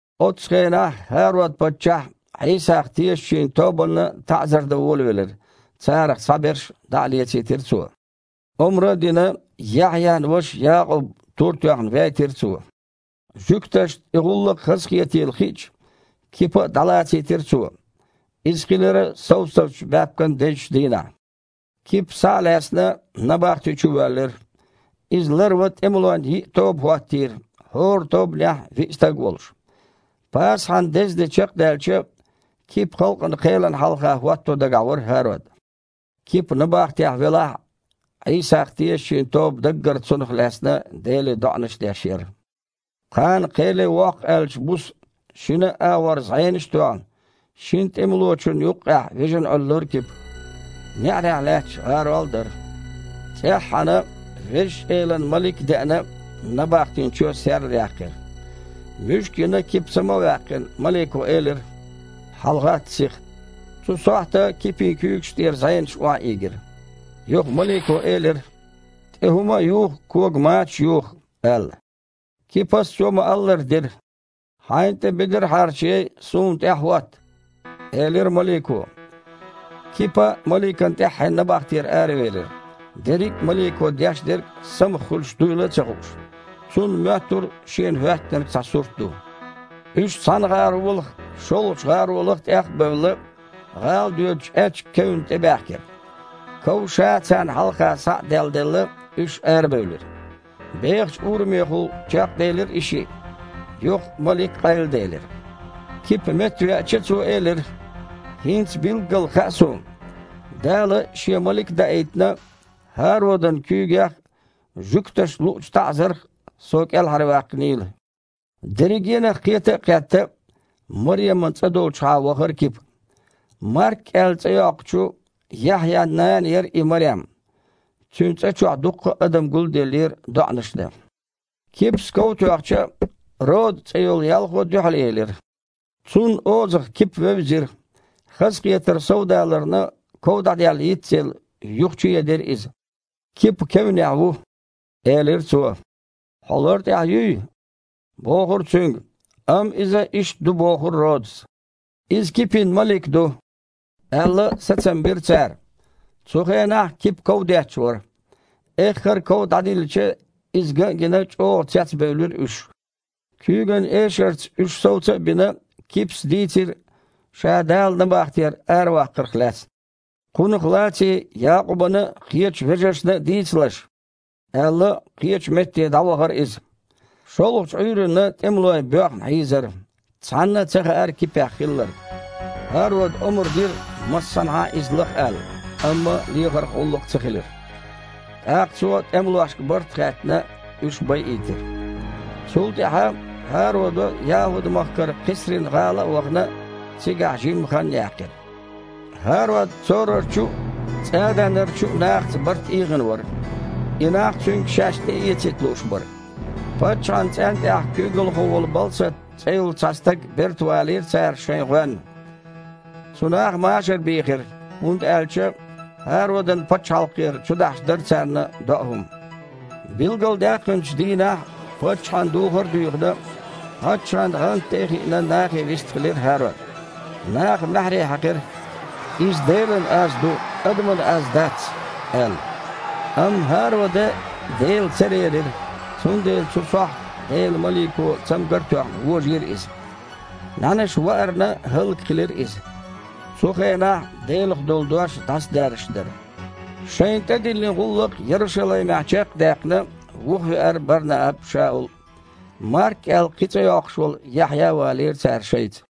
Оццу хенахь ХІарод-паччахь Іийсах тешачийн тобанна таІзар дан волавелира, царах цхьаберш дІа а лецийтира цо. Омра а дина, Яхьъян ваша Якъуб тур тоьхна вейтира цо. Жуьгташна и гІуллакх хазахетийла хиъча, Кипа а дІалацийтира цо. (Иза хилира совсазчу баьпкан дезачу дийнахь.) Кипа, схьа а лаьцна, набахти чу воьллира. Иза ларван тІемалойн йиъ тоба хІоттийра, хІора тобанехь виъ стаг а волуш. Пасахьан деза де чекхдаьлча Кипа халкъан кхелана хьалха хІотто дагахь вара ХІарод. Кипа набахтехь велахь а, Іийсах тешачийн тоба даггара цунах лаьцна Деле доІанаш деш яра. Кхана кхеле воккху аьллачу буса, шина а агІор зІенаш а тоьхна, шина тІемалочунна юккъехь вижина Іуьллура Кипа. НеІарехь лаьтташ гІарол а дара. ЦІеххьана Везачу Элан малик а деана, набахтин чоь серлаяьккхира. Муьшка йина, Кипа сама а ваьккхина, малико элира: «ХьалагІатта сиха!» Цу сохьта Кипин куьйгаш тІера зІенаш охьаийгира. Юха малико элира: «ТІе хІума а юха, кога мачаш а юха», – аьлла. Кипас цо ма-аллара дира. «Хьайна тІе бедар а хьарчаяй, суна тІаьхьахІотта», – элира малико. Кипа маликана тІаьххье набахтера аравелира, дерриг а малико деш дерг самах хуьлуш дуйла а ца хууш. Цунна моьттура шена хІоьттинарг цхьа сурт ду. Уьш цхьана гІаролах а, шолгІачу гІаролах а тІех а бевлла, гІала доьдучу аьчка кевнна тІебаьхкира. Ков ша царна хьалха схьа а делладелла, уьш арабевлира. Бехачу урамехула чекхделира и шиъ, юха малик къайладелира. Кипа меттавеача, цо элира: «ХІинца билггала хаьа суна, Дала, Шен малик а даийтина, ХІародан куьйгех а, жуьгташна луучу таІзарх а со кІелхьарваьккхинийла». Дерригенах кхета а кхетта, Мареман цІа долчухьа вахара Кипа. Марк аьлла цІе йоккхучу Яхьъян нана яра и Марем. Цуьнан цІа чохь дуккха а адам гулделлера доІанаш дан. Кипас ков тоьхча, Рода цІе йолу ялхо дуьхьалъелира. Цунна озах Кипа вевзира. Хазахетар совдаларна, ков дІаделла йиц а елла, юха чуедира иза. «Кипа кевнехь ву!» – элира цо. «Хьо лартІехь юй!» – бохура цуьнга. Амма иза иштта ду бохура Родас. «Иза Кипин малик ду», – аьлла, сацам бира цара. Цу хенахь Кипа ков детташ вара. Эххар а ков дІадиллича, иза ган а гина, чІогІа цецбевлира уьш. Куьйган эшарца уьш совца а бина, Кипас дийцира ша Дала набахтера араваккхарх лаьцна. «Кхунах лаций Якъубана а, кхечу вежаршна а дийцалаш», – аьлла, кхечу метте дІавахара иза. ШолгІачу Іуьйранна тІемалой боьхна хьийзара, цхьанна а ца хаьара Кипех хилларг. ХІарода омра дира, массанхьа а иза лаха аьлла, амма лехарх гІуллакх ца хилира. ТІаккха цо, тІемалошка барт а хаьттина, уьш байийтира. Цул тІаьхьа ХІарода, ЯхІуд-махкара Кхесрин-гІала а вахана, цигахь жимма хан яьккхира. ХІарод Цорарчу а, ЦІаданарчу а нахаца барт ийгІина вара. И нах цуьнга шаьш тІеэцийта лууш бара. Паччахьан цІентІехь куьйгалхо волу Балсат цІе йолу цхьа стаг бертавалийра цара шайна гІоьнна. Цу наха машар бийхира, хІунда аьлча ХІародан пачхьалкхера чудахьаш дара царна доу хІума. Билгалдаьккхинчу дийнахь паччахьан духар а дуьйхина, паччахьан гІанта тІе а хиина, нахе вистхилира ХІарод. Наха маьхьарий хьаькхира: «Иза Делан аз ду, адаман аз дац!» – аьлла. Амма ХІарода Дела ца лерира, цундела цу сохьта Делан малико, цамгар а тоьхна, вожийра иза. НІаьнаша ваарна, хІаллакьхилира иза. Цу хенахь Делах долу Дош дІасадаьржаш дара. Шайна тІедиллина гІуллакх Ярушалаймехь чекх а даьккхина, вухавеара Бар-Нааб а, Шаул а. Марк аьлла кхин а цІе йоккхуш волу Яхьъя а валийра цара шайца.